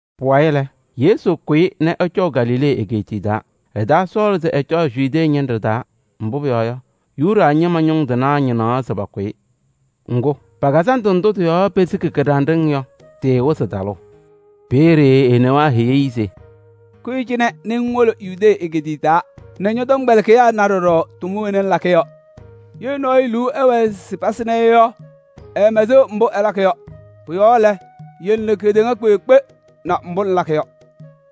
Pʋwayɩ lɛ, Yesu kʋyɩ nɛ ɛcɔʋ Galilee egeetiye taa. Ɛtaasɔɔlɩ se ɛcɔɔ Yudee ñɩnɖɛ taa, mbʋ pʋyɔɔ yɔ, Yuda ñɩma ñʋŋ tɩnaa ñɩnaɣ se pakʋ-ɩ. Ŋgʋ, pa-kazandʋ ndʋ pesiki kɩɖanɖɩŋ yɔ, tɩɩwɩzɩ talʋʋ. Peeye e-newaa heyi-i se: “Kʋyɩ cɩnɛ nɛ ŋwolo Yudee egeetiye taa nɛ ñɔ-tɔmkpɛlɩkɩyaa na ɖɔɖɔ tʋma wena ŋlakɩ yɔ. Ye nɔɔyʋ liu ɛwɛɛ se pasɩm-ɩ yɔ, ɛɛmɛsɩɣ mbʋ ɛlakɩ yɔ. Pʋ-yɔɔ lɛ, yele nɛ kedeŋa kpeekpe na mbʋ ŋlakɩ yɔ.”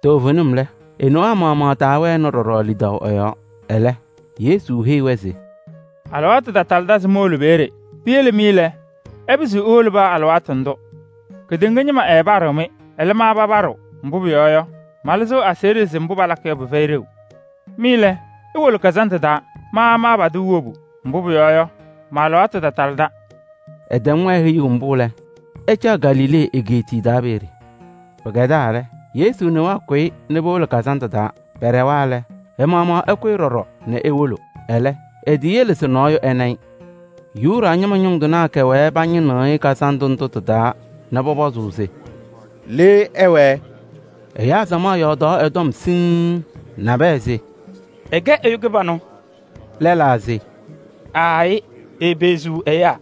Toovenim lɛ, e-newaa maɣmaɣ taawɛnɩ ɖɔɖɔ lidaʋ ɛ-yɔɔ. Ɛlɛ, Yesu heyi-wɛ se: “Alɩwaatʋ tatalɩdɩ se mowolo peeye. Piyele mɩ lɛ, ɩpɩzɩɣ iwolo paa alɩwaatʋ ndʋ. Kedeŋa ñɩma ɛɛpaɖɩɣ-mɩ, ɛlɛ, ma papaɖɩɣ. Mbʋ pʋyɔɔ yɔ, malɩzɩɣ aseɣɖe se mbʋ palakɩ yɔ, pɩfɛyɩ ɖeu. Mɩ lɛ, iwolo kazandʋ taa, ma maapadɩɣ wobu, mbʋ pʋyɔɔ yɔ, ma-alɩwaatʋ tatalɩda.” Ɛtɛm-wɛ heyuu mbʋ lɛ, ɛcaɣ Galilee egeetiye taa peeye. Pɩkɛdaa lɛ, Yesu newaa kʋyɩ nɛ powolo kazandʋ taa. Pɛɖɛwa lɛ, ɛ-maɣmaɣ ɛkʋyɩ ɖɔɖɔ nɛ ewolo. Ɛlɛ, eteyele se nɔɔyʋ ɛna-ɩ. Yuda ñɩma ñʋŋ tɩnaa kɛwɛɛ pañɩnɩɣ-ɩ kazandʋ ndʋ tɩ-taa nɛ pɔpɔzʋʋ se: “Le ɛwɛɛ?” Ɛyaa samaɣ yɔɔdaɣ ɛ-tɔm siŋŋ: nabɛyɛ se: “Ɛkɛ ɛyʋ kɩbanʋ.” Lɛlaa se: “Aayɩ, epeɣziɣ ɛyaa.”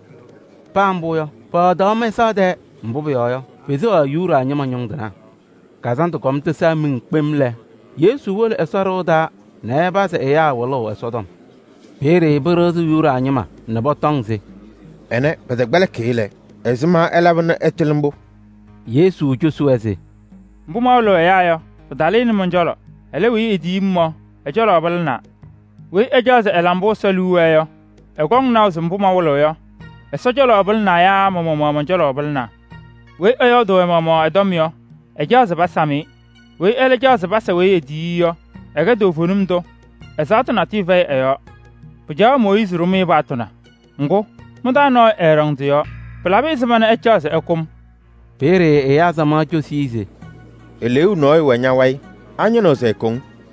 Paa mbʋ yɔ, pɔyɔɔdaɣ mɛsaɣ tɛɛ, mbʋ pʋyɔɔ yɔ, peseɣaɣ Yuda ñɩma ñʋŋ tɩnaa. Kazandʋ kɔm tɩsaa miŋ kpem lɛ, Yesu wolo Ɛsɔ ɖɩɣa taa nɛ ɛpazɩ ɛyaa wɩlʋʋ Ɛsɔtɔm. Peeye pɩɖɩɣzɩ Yuda ñɩma nɛ pɔtɔŋ se: “Ɛnɛ, pɛtɛkpɛlɩkɩ-ɩ lɛ, ɛzɩma ɛlaba nɛ ɛtɩlɩ mbʋ?” Yesu cosi-wɛ se: “Mbʋ mawɩlɩɣ ɛyaa yɔ, pɩtalɩnɩ mɔn-cɔlɔ, ɛlɛ, weyi etiyi-m yɔ, ɛ-cɔlɔ pɩlɩnaa. Weyi ɛcaɣ se ɛla mbʋ Ɛsɔ liu wɛɛ yɔ, ɛkɔŋ naʋ se mbʋ mawɩlɩɣ yɔ, Ɛsɔ cɔlɔ pɩlɩnaa yaa ma-maɣmaɣ mɔn-cɔlɔ pɩlɩnaa. Weyi ɛyɔɔdʋʋ ɛ-maɣmaɣ ɛ-tɔm yɔ, ɛcaɣ se pasam-ɩ. Weyi ɛlɛ caɣ se pasa weyi etiyi-i yɔ, ɛkɛ toovenim tʋ, ɛzaɣtʋ natʋyʋ fɛyɩ ɛ-yɔɔ. Pɩcaɣaɣ Mooyiizi ɖʋ-mɩ paɣtʋ na? Ŋgʋ, mɩ-taa nɔɔyʋ ɛɛɖɔŋ tɩ-yɔɔ. Pɩlabɩ ɛzɩma nɛ ɩcaɣ se ɩkʋ-m?” Peeye ɛyaa samaɣ cosi-i se: “Eleeu nɔɔyʋ wɛ ña-wayɩ. Añɩnɩɣ se ɛkʋ-ŋ?”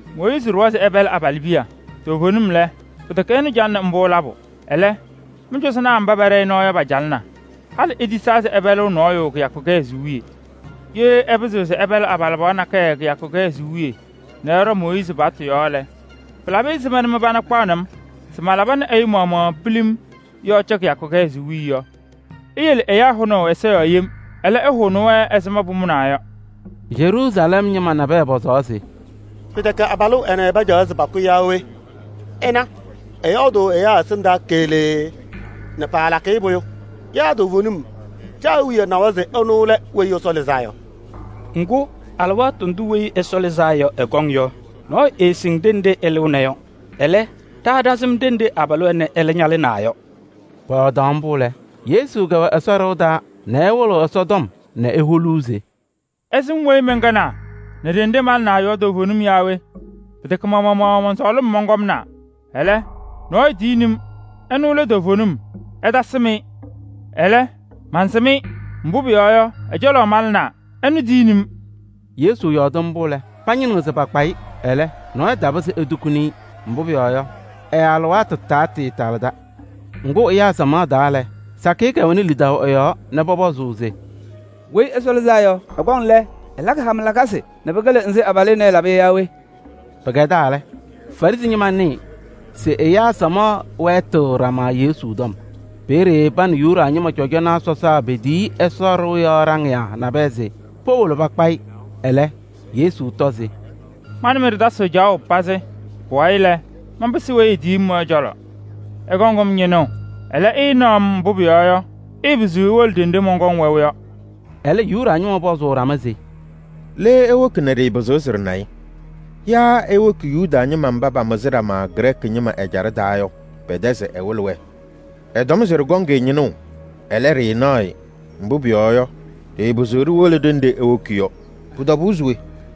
Mooyiizi ɖʋwa se ɩpɛlɩ abalɩbiya. Toovenim lɛ, pɩtɛkɛ ɛnʋ calɩnɩ mbʋ labʋ, ɛlɛ, mɩ-cɔzɔnaa mba pɛɖɛ-ɩ nɔɔ yɔ, pacalɩna. Halɩ itisaa se ɩpɛlɩɣ nɔɔyʋ kɩyakʋ kɩhɛzʋʋ wiye. Ye ɩpɩzɩɣ se ɩpɛlɩ abalɩbɩɣa nakɛyɛ kɩyakʋ kɩhɛzʋʋ wiye nɛ ɩɖɔ Mooyiizi paɣtʋ yɔɔ lɛ, pɩlabɩ ɛzɩma mɩ-pana kpaɣnɩ-m se malaba nɛ ɛyʋ maɣmaɣ pilim yɔɔ cɛ kɩyakʋ kɩhɛzʋʋ wiye yɔ? Iyele ɛyaa hʋnaʋ ɛza yɔɔ yem. Ɛlɛ, ɩhʋnɩ-wɛ ɛzɩ pʋmʋnaʋ yɔ.” Yeruusalɛm ñɩma nabɛyɛ pɔzaɣ se: “Pɩtɛkɛ abalʋ ɛnɛ pacaɣ se pakʋ yaa we? Ɩna, ɛyɔɔdʋʋ ɛyaa ɛsɩndaa keɣlee nɛ paalakɩ-ɩ pʋyʋ! Yaa toovenim ɖa-awiya nawa se ɛnʋ lɛ Weyi Ɛsɔ Lɩzaa Yɔ? Ŋgʋ, alɩwaatʋ ndʋ Weyi Ɛsɔ Lɩzaa Yɔ ɛkɔŋ yɔ, nɔɔyʋ ɛɛsɩŋ ɖenɖe ɛlɩɣna yɔ. Ɛlɛ, ɖa ɖasɩm ɖenɖe abalʋ ɛnɛ ɛlɛ ñalɩnaa yɔ.” Pɔyɔɔdaɣ mbʋ lɛ, Yesu kɛwɛ Ɛsɔ ɖɩɣa taa nɛ ɛwɩlɩɣ Ɛsɔtɔm nɛ eholuu se: “Ɩsɩm weyi mɛnkɛnaa nɛ ɖenɖe malɩnaa yɔ toovenim naa we? Pɩtɛkɛ ma-maɣmaɣ mɔn-sɔɔlɩm mɔnkɔmnaa. Ɛlɛ, nɔɔyʋ tiyini-m, ɛnʋ lɛ toovenim tʋ, ɩtasɩm-ɩ. Ɛlɛ, ma mansɩm-ɩ, mbʋ pʋyɔɔ yɔ, ɛ-cɔlɔ malɩnaa, ɛnʋ tiyini-m.” Yesu yɔɔdɩ mbʋ lɛ, pañɩnɩɣ se pakpa-ɩ, ɛlɛ, nɔɔyʋ tapɩzɩ etukuni ɛ-yɔɔ. Mbʋ pʋyɔɔ yɔ, ɛ-alɩwaatʋ taatalɩda. Ŋgʋ ɛyaa samaɣ taa lɛ, sakɩyɛ kɛwɛnɩ lidaʋ ɛ-yɔɔ nɛ pɔpɔzʋʋ se: “Weyi Ɛsɔ Lɩzaa Yɔ, ɛkɔŋ lɛ, ɛlakɩ hama lakasɩ nɛ pɩkɩlɩ nzɩ abalʋ ɛnɛ ɛlaba yɔ yaa we?” Pɩkɛdaa lɛ, Farɩsɩ ñɩma nɩɩ se ɛyaa samaɣ wɛɛtɩɣ ɖama Yesu tɔm mbʋ. Peeye pa nɛ Yuda ñɩma cɔjɔnaa sɔsaa petiyi Ɛsɔ ɖɩɣa yɔɔ ɖaŋɩyaa nabɛyɛ se powolo pakpa-ɩ. Ɛlɛ Yesu tɔ se: “Ma nɛ mɩ ɖɩtasɩɣ caɣʋ pazɩ. Pʋwayɩ lɛ, manpɩsɩɣ weyi etiyi-m yɔ ɛ-cɔlɔ. Ɩkɔŋ-m ñɩnʋʋ, ɛlɛ, ɩɩnaɣ-m. Mbʋ pʋyɔɔ yɔ, ɩɩpɩzɩɣ iwolo ɖenɖe mɔnkɔŋ wɛʋ yɔ.” Ɛlɛ Yuda ñɩma pɔzʋʋ ɖama se: “Le ewoki nɛ ɖɩɩpɩzɩɣ se ɖɩna-ɩ? Yaa ewoki Yuda ñɩma mba pamɩzɩ ɖama Grɛɛkɩ ɛjaɖɛ taa yɔ pɛ-tɛ se ɛwɩlɩ-wɛ? Ɛtɔm se ɖɩkɔŋ-ɩ ñɩnʋʋ, ɛlɛ, ɖɩɩnaɣ-ɩ, mbʋ pʋyɔɔ yɔ, ɖɩɩpɩzɩɣ ɖiwolo ɖenɖe ewoki yɔ, pʋ-tɔbʋʋ se we?”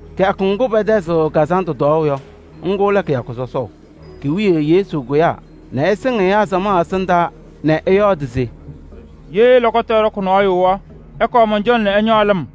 Kɩyakʋ ŋgʋ pɛtɛzɩɣ kazandʋ tɔɔʋ yɔ, ŋgʋ lɛ kɩyakʋ sɔsɔʋ. Ki-wiye Yesu kʋyaa nɛ ɛsɩŋ ɛyaa samaɣ ɛsɩndaa nɛ ɛyɔɔdɩ se: “Ye lɔkɔtʋ ɛɖɔkɩ nɔɔyʋ yɔ, ɛkɔɔ mɔn-cɔlɔ nɛ ɛñɔɔ lɩm.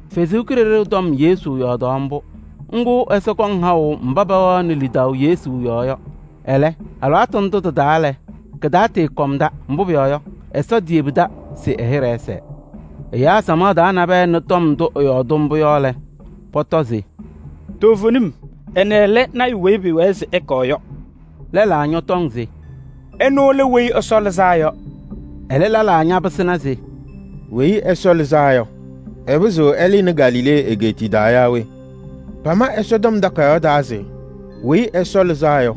Ɛsɔ Kalɩzaɣ tɔm Yesu yɔɔdaɣ mbʋ. Ŋga Ɛsɔ kɔŋ haʋ mba pɛwɛɣnɩ lidaʋ Yesu yɔɔ yɔ. Ɛlɛ, alɩwaatʋ ndʋ tɩ-taa lɛ, katatɩɩkɔmda, mbʋ pʋyɔɔ yɔ, Ɛsɔ teyebidi se ɛ-hɩɖɛ ɛsɛɛ. Ɛyaa samaɣ taa nabɛyɛ nɩ tɔm ndʋ ɛyɔɔdɩ mbʋ yɔ lɛ, pɔtɔ se: “Toovenim, ɛnɛ lɛ lɔɔyaɣ tʋ weyi pɩɩwɛɛ se ɛkɔɔ yɔ!” Lɛlaa ñɔtɔŋ se: “Ɛnʋ lɛ Weyi Ɛsɔ Lɩzaa Yɔ!” Ɛlɛ lɛlaa ñapɩsɩna se: “Weyi Ɛsɔ Lɩzaa Yɔ, ɛpɩzɩɣ ɛlɩnɩ Galilee egeetiye taa yaa we? Pama Ɛsɔtɔm Takayaɣ taa se: ‘Weyi Ɛsɔ Lɩzaa Yɔ,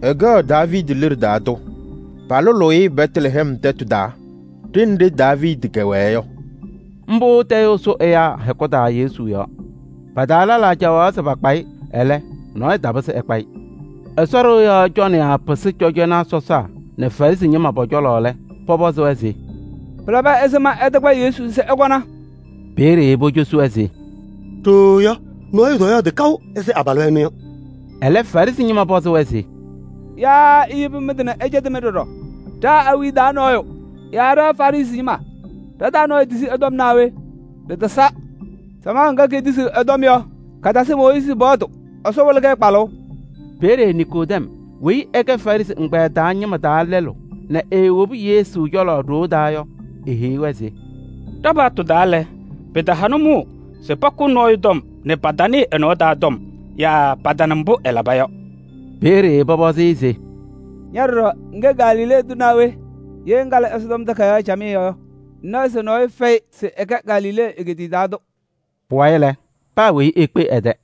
ɛkɛɣ Daaviidi liɖe taa tʋ. Palʋlʋʋ-ɩ Bɛtlɛhɛm tɛtʋ taa ɖenɖe Daaviidi kɛwɛɛ yɔ.’” Mbʋ tayʋʋ sʋ ɛyaa hɛkʋ taa Yesu yɔɔ. Pa-taa lɛlaa caɣaɣ se pakpa-ɩ, ɛlɛ, nɔɔyʋ totukuni ɛ-yɔɔ. Ɛsɔ ɖɩɣa yɔɔ cɔnɩyaa pɩsɩ cɔjɔnaa sɔsaa nɛ Farɩsɩ ñɩma pɔ-cɔlɔ lɛ, pɔpɔzɩ-wɛ se: “Pɩlabɩ ɛzɩma ɩtakpa Yesu se ɩkɔna?” Peeye pocosi-wɛ se: “Ɖooo yɔ, nɔɔyʋ tɔyɔɔdɩ kaʋ ɛzɩ abalʋ ɛnʋ yɔ.” Ɛlɛ Farɩsɩ ñɩma pɔzɩ-wɛ se: “Yaa iyebi mɩ-tɩ nɛ ɛcɛtɩ-mɩ ɖɔɖɔ? Ɖa-awiya taa nɔɔyʋ yaa ɖa Farɩsɩ ñɩma, ɖa-taa nɔɔyʋ tisi ɛ-tɔm naa we? Ɖɩtasa. Samaɣ ŋga, katasɩ Mooyiizi paɣtʋ, Ɛsɔ wɩlɩ-kɛ kpalʋʋ!” Peeye Niikodɛm weyi ɛkɛ Farɩsɩ ɛgbɛyɛ taa ñɩma taa lɛlʋ nɛ eewobi Yesu cɔlɔ ɖoo taa yɔ, eheyi-wɛ se: “Ɖa-paɣtʋ taa lɛ, pɩtaha nʋmɔʋ se pakʋ nɔɔyʋ tɔm nɛ patanɩɩ ɛ-nɔɔ taa tɔm yaa patana mbʋ ɛlaba yɔ.” Peeye pɔpɔzɩ-ɩ se: “Ña ɖɔɖɔ ŋkɛ Galilee tʋ naa we? Ye ŋkalɩ Ɛsɔtɔm Takayaɣ camɩyɛ yɔ, ŋnaɣ se Galilee tʋ nɔɔyʋ tɛkɛdɩ lɔɔyaɣ tʋ.” [ Pʋwayɩ lɛ, paa weyi ekpe ɛ-tɛ.